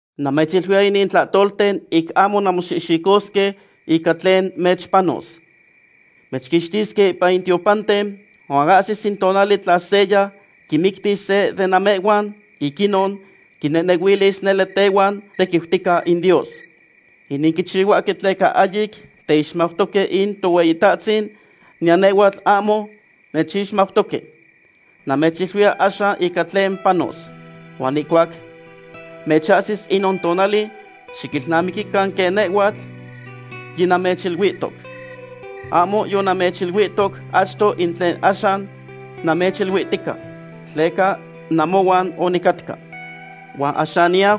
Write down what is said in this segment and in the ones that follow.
’Namechiluiya inin tlahtolten ic ahmo nanmoxihxicosque ica tlen mechpanos. Mechquixtisque ipan in tiopanten, huan ahsis in tonali tla seya quimictis se de namehhuan, ic inon quinehnehuilis nele tehuan tequiutica in Dios. Inin quichihuahque tleca ahyic teixmautoque in Tohueyitahtzin, niyan nehhuatl ahmo nechixmautoque. Namechiluiya axan ica tlen panos. Huan ihcuac mechahsis inon tonali, xiquilnamiquican quen nehhuatl yinamechiluihtoc. ’Ahmo yonamechiluihtoc achto in tlen axan namechiluihtica, tleca namohuan onicatca. Huan axan niyau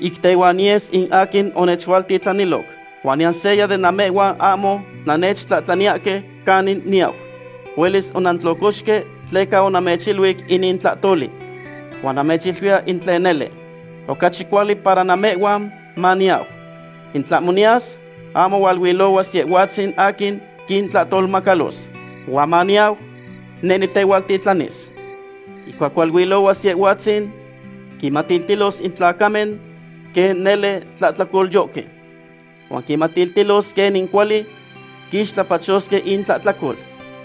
ic tehuan niyes in aquin onechualtitlaniloc. Huan niyan seya den namehhuan ahmo nannechtlahtlaniyahque canin niyau. Huelis onantlocoxque tleca onamechiluic inin tlahtoli. Huan namechiluiya in tlen nele. Ocachi cuali para namehhuan maniyau. In tlahmo niyas, ahmo hualuilohuas Yehhuatzin aquin quintlahtolmacalos. Huan maniyau, neh nitehualtitlanis. Ihcuac hualuilohuas Yehhuatzin, quinmatiltilos in tlacamen quen nele tlahtlacolyohque. Huan quinmatiltilos quenin cuali quixtlapachosque intlahtlacol.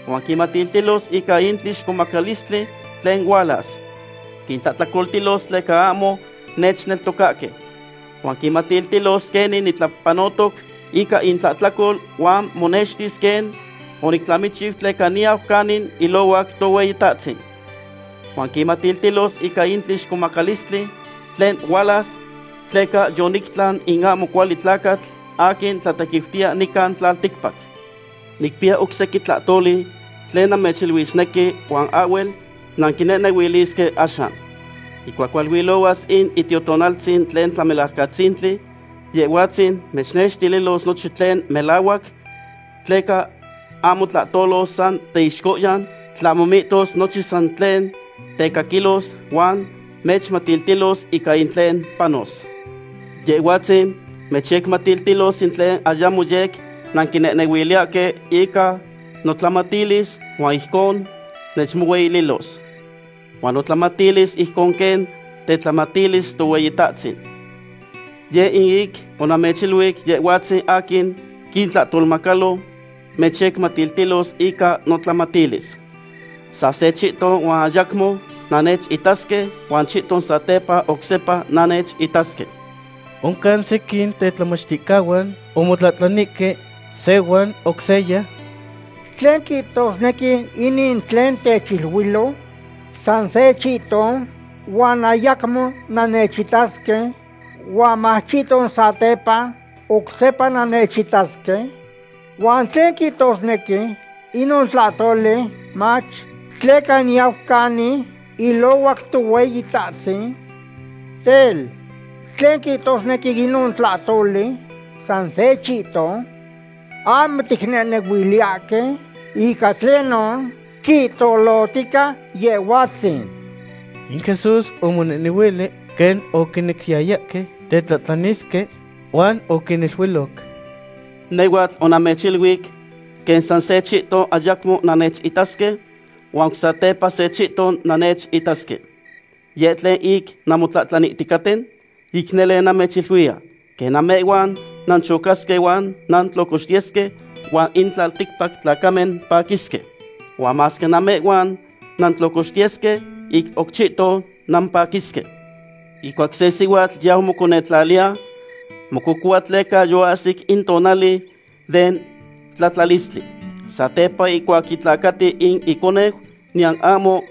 Huan quinmatiltilos ica in tlixcomacalistli tlen hualas. Quintlahtlacoltilos tleca ahmo nechneltocahque. Huan quinmatiltilos quenin nitlapanotoc ica intlahtlacol huan monextis quen onictlamichiu tleca niyau canin ilohuac Tohueyitahtzin. Huan quinmatiltilos ica in tlixcomacalistli tlen hualas, tleca yonictlan in ahmo cuali tlacatl aquin tlatequiutiya nican tlalticpac. ’Nicpiya oc sequin tlahtoli tlen namechiluisnequi huan ahhuel nanquinehnehuilisque axan. Ihcuac hualuilohuas in Itiotonaltzin tlen Tlamelajcatzintli, Yehhuatzin mechnextililos nochin tlen melahuac. Tleca ahmo tlahtolos san teixcohyan, tlahmo mihtos nochin san tlen tecaquilos, huan mechmatiltilos ica in tlen panos. Yehhuatzin mechyecmatiltilos in tlen ayamo yec nanquinehnehuiliyahque ica notlamatilis, huan ijcon nechmohueyililos. Huan notlamatilis ijcon quen tetlamatilis Tohueyitahtzin. Yeh in ic onamechiluic Yehhuatzin aquin quintlahtolmacalo mechyecmatiltilos ica notlamatilis. ’Sa se chihton huan ayacmo nannechitasque, huan chihton satepa oc sepa nannechitasque. Oncan sequin tetlamachticahuan omotlahtlanihque se huan oc seya: ―¿Tlen quihtosnequi inin tlen techiluilo; sa se chihton huan ayacmo nannechitasque, huan mach chihton satepa oc sepa nannechitasque? ¿Huan tlen quihtosnequi inon tlahtoli, mach, “tleca niyau canin ilohuac Tohueyitahtzin”? Tel, ¿tlen quihtosnequi inon tlahtoli, “sa se chihton”? Ahmo ticnehnehuiliyahque ica tlenon quihtolohtica Yehhuatzin. In Jesús omonehnehuili quen oquinequiyayahque tetlahtlanisque, huan oquiniluiloc: ―Nehhuatl onamechiluic quen sa se chihton ayacmo nannechitasque, huan oc sepa se chihton nannechitasque. ¿Yeh in tlen ic nanmotlahtlaniticaten? Ic nele namechiluiya, quen namehhuan nanchocasque huan nantlocoxtiyesque, huan in tlalticpac tlacamen paquisque. Huan masque namehhuan nantlocoxtiyesque, ic oc chihton nampaquisque. Ihcuac se sihuatl yau moconetlaliya, mococohua tleca yoahsic in tonali den tlatlalistli. Satepa ihcuac yitlacati in iconeu, niyan ahmo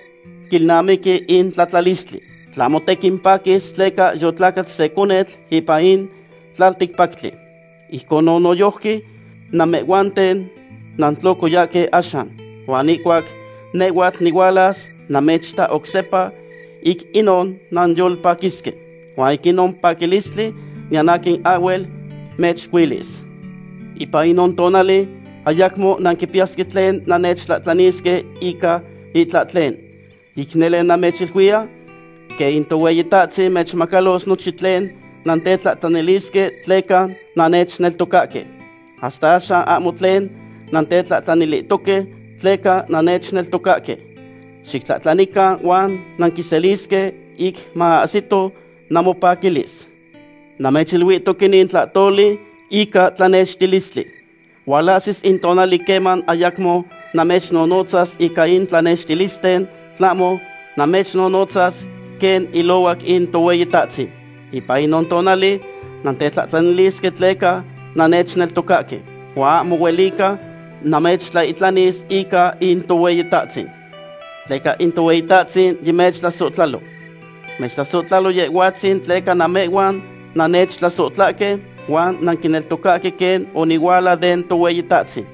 quilnamiqui in tlatlalistli, tlahmo tequin paquis tleca yotlacat se conetl ipan in tlalticpactli. Ijconon noyojqui, namehhuanten nantlocoyahque axan. Huan ihcuac nehhuatl nihualas namechita oc sepa, ic inon nanyolpaquisque. Huan inon paquilistli niyan aquin ahhuel mechcuilis. ’Ipan inon tonali ayacmo nanquipiyasque tlen nannechtlahtlanisque ica itlahtlen. Ic nele namechiluiya, quen in Tohueyitahtzin mechmacalos nochin tlen nantetlahtlanilisque tleca nannechneltocahque. Hasta axan ahmo tlen nantetlahtlanilihtoque tleca nannechneltocahque. Xictlahtlanican huan nanquiselisque, ic maahsito namopaquilis. ’Namechiluihtoc inin tlahtoli ica tlanextilistli. Hualahsis in tonali queman ayacmo namechnonotzas ica in tlanextilisten, tlahmo namechyecnonotzas quen ilohuac in Tohueyitahtzin. Ipan inon tonali nantetlahtlanilisque tleca nannechneltocahque, huan ahmo huelica namechtlaihtlanis ica in Tohueyitahtzin. Tleca in Tohueyitahtzin yimechtlasohtlaloc. Mechtlasohtlalo Yehhuatzin tleca namehhuan nannechtlasohtlahque, huan nanquineltocatoque quen onihuala den Tohueyitahtzin.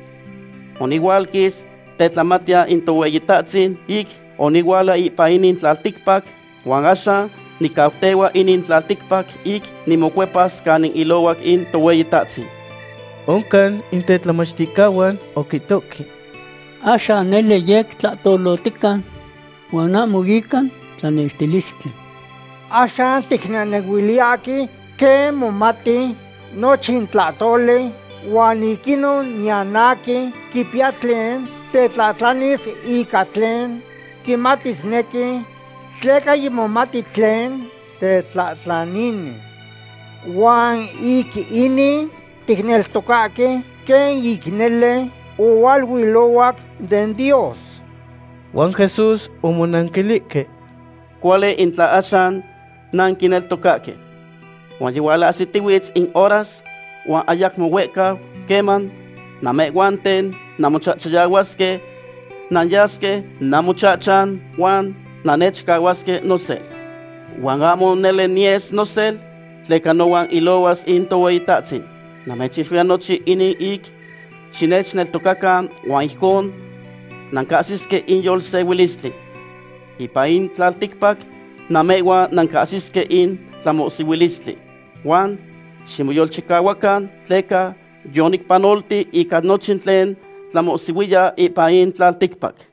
Onihualquis tetlamatiyan in Tohueyitahtzin ic onihuala ipan inin tlalticpac, huan axan nicautehua inin tlalticpac ic nimocuepas canin ilohuac in Tohueyitahtzin. Oncan in tetlamachticahuan oquihtohque: ―Axan nele yec tlahtolohtica, huan ahmo ica tlanextilistli. Axan ticnehnehuiliyahque quen momati nochin tlahtoli huan ic inon niyan aquin quipiya tlen tetlahtlanis ica tlen quimatisnequi, tleca yimomati tlen tetlahtlanini. Huan ic inin ticneltocahque quen ic nele ohualuilohuac den Dios. Huan Jesús omonanquilihque: ―Cuali in tla axan nanquineltocahque. Huan yihualahsitihuitz in horas, huan ayacmo huehcau, queman namehhuanten namochachayahuasque nanyasque namochahchan, huan nannechcahuasque nosel. Huan ahmo nele niyes nosel, tleca nohuan ilohuas in Tohueyitahtzin. Namechiluiya nochin inin ic xinechyecneltocacan huan ijcon nancahsisque in yolsehuilistli. Ipan in tlalticpac namehhuan nancahsisque in tlamohsihuilistli. Huan ximoyolchicahuacan, tleca yonicpanolti ica nochin tlen tlamohsihuiya ipan in tlalticpac.